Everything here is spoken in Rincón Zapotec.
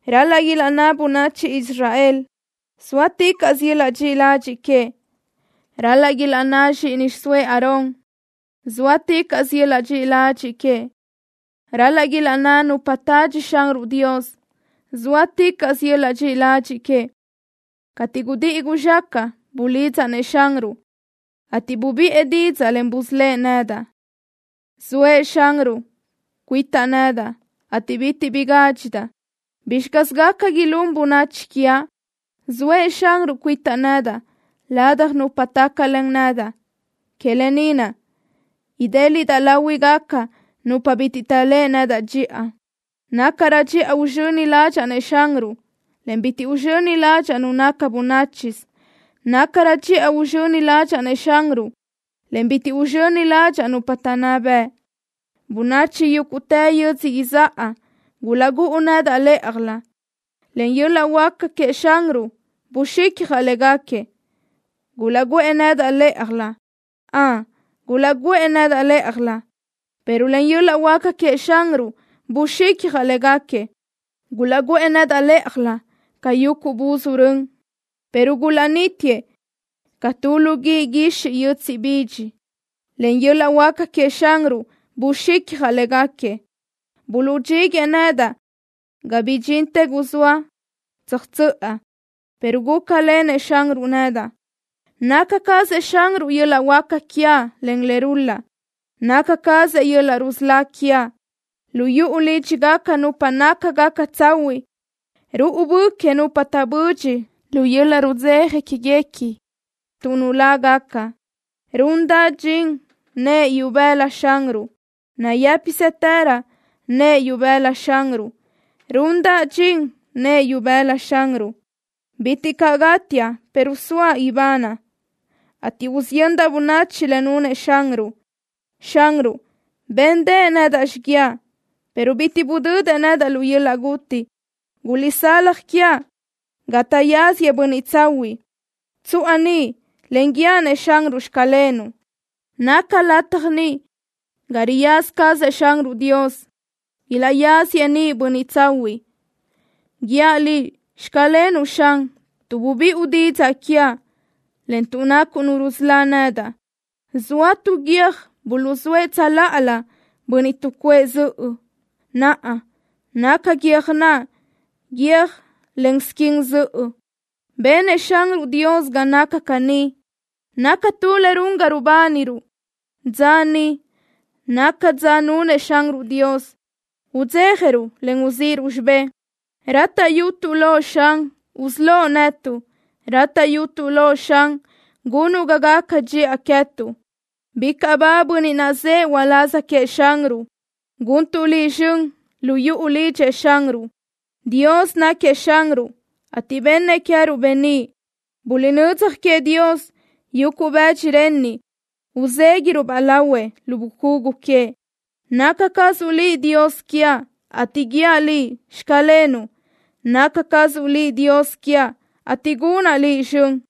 Ral-laʼ ilaʼnná bönachi Israel: “¡Zóaticaʼsö yöl-laʼ dxiʼi ladxiʼ queëʼ!” Ral-laʼ ilaʼnná zxíʼini xiʼsóëʼ Aarón: “¡Zóaticaʼsö yöl-laʼ dxiʼi ladxiʼ queëʼ!” Ral-laʼ ilaʼnná nupa tadxi Xanruʼ Dios: “¡Zóaticaʼsö yöl-laʼ dxiʼi ladxiʼ queëʼ!” Cateʼ gudíʼi guzxácaʼa bulidzaʼ-nëʼ Xanruʼ, ateʼ bubiʼë didzaʼ, en busölë́ʼ nedaʼ. Zoëʼ Xanruʼ cuitaʼ nedaʼ, ateʼ bitiʼ bi gádxidaʼ. ¿Bizxi caz gaca ilún bönachi quiaʼ? Zoëʼ Xanruʼ cuitaʼ nedaʼ ladaj nupa tácalen nedaʼ. Que lë ni naʼ idéliʼdaʼ láhuigaca nupa bitiʼ taʼléʼe nedaʼ dxiʼa. Nácarö dxiʼa uzxöni ládxaʼa-nëʼ Xanruʼ, en bitiʼ uzxöni ládxaʼa nu naca bönáchisö. Nácarö dxiʼa uzxöni ládxaʼa-nëʼ Xanruʼ, en bitiʼ uzxöni ládxaʼa nupa taʼnná bëʼ. Bönachi yúguʼtë yödzö izáʼa gulaʼgúʼu nedaʼ lë́ʼajlö. Len yöl-laʼ huáca queëʼ Xanruʼ buxicjaʼ léguequi. Gulaʼguʼë nedaʼ lë́ʼajlö. Ön, gulaʼguʼë nedaʼ lë́ʼajlö, pero len yöl-laʼ huáca queëʼ Xanruʼ buxicjaʼ léguequi. Gulaʼguʼë nedaʼ lë́ʼajlö ca yuguʼ buzúʼ rön, pero gulaʼnítiëʼ ca tu lu guíʼ guixiʼ yötsiʼ bidx. Len yöl-laʼ huáca queëʼ Xanruʼ buxicjaʼ léguequi. Buluʼdxíguëʼë nedaʼ ga bidxintë guzóa tsöjtsöʼa, pero gúcalenëʼ Xanruʼ nedaʼ. Naca cazëʼ Xanruʼ yöl-laʼ huáca quiaʼ, en le rul-laʼ. Naca cazëʼ yöl-laʼ rusölá quiaʼ. Lu yuʼu lídxigaca nupa nácagaca tsahuiʼ ruʼu bö que nupa taʼbö́dxiʼa lu yöl-laʼ rudzeja quéguequi tuʼ nulágaca. ¡Rundaʼ dxin nëʼë ibëla Xanruʼ! ¡Nayë́pisëtërö nëʼë ibëla Xanruʼ! ¡Rundaʼ dxin nëʼë ibëla Xanruʼ! Bitiʼ caʼ gátiaʼ, pero soaʼ ibanaʼ, ateʼ usiyöndaʼ bönachi le nunëʼ Xanruʼ. Xanruʼ béndëʼë nedaʼ xiguiaʼ, pero bitiʼ budödëʼ nedaʼ lu yöl-laʼ guti. Guliʼsalaj quiaʼ ga taʼyazëʼ bönniʼ tsahuiʼ. Tsuʼa niʼ, en guíaʼ-nëʼ Xanruʼ: “Xclenuʼ.” Naca lataj ni ga riyaza cazëʼ Xanruʼ Dios. Ilaʼyazëʼ ni bönniʼ tsahuiʼ. ¡Guíaʼ Liʼ: “Xclenuʼ” Xan, tuʼ bubiʼu didzaʼ quiaʼ, en tuʼ nacuʼ Nu rusölá nedaʼ! Zoa tu guiö́j buluʼzóëʼ tsöláʼalö bönniʼ tuʼcuʼë zöʼö. Naʼa naca guiö́j naʼ guiö́j len squin zöʼö. Benëʼ Xanruʼ Dios ga naca caní. Naca tu le run ga rubániruʼ. Dza ni naca dza nunëʼ Xanruʼ Dios. Udzéjaruʼ, en uzíʼiruʼ xibé. Rátaʼyutuʼ loʼ, Xan, usölóʼ netuʼ. Rátaʼyutuʼ loʼ, Xan, gunuʼ ga gaca dxiʼa queë́tuʼ. Bicaʼ ba bönniʼ naʼ zëʼë uláz queëʼ Xanruʼ. Guntuʼ Liʼ zxön lu yuʼu lidxëʼ Xanruʼ. Dios náquiëʼ Xanruʼ, ateʼ bennëʼ queë́ruʼ beníʼ. Buliʼnödzaj queëʼ Dios yuguʼ bëdxi renniʼ uzéguiʼruʼ-baʼ lahuëʼ lu bucugu queëʼ. Naca cazuʼ Liʼ Dios quiaʼ, ate guíaʼ Liʼ: “Xclenuʼ.” Naca cazuʼ Liʼ Dios quiaʼ, ateʼ gunaʼ Liʼ zxön.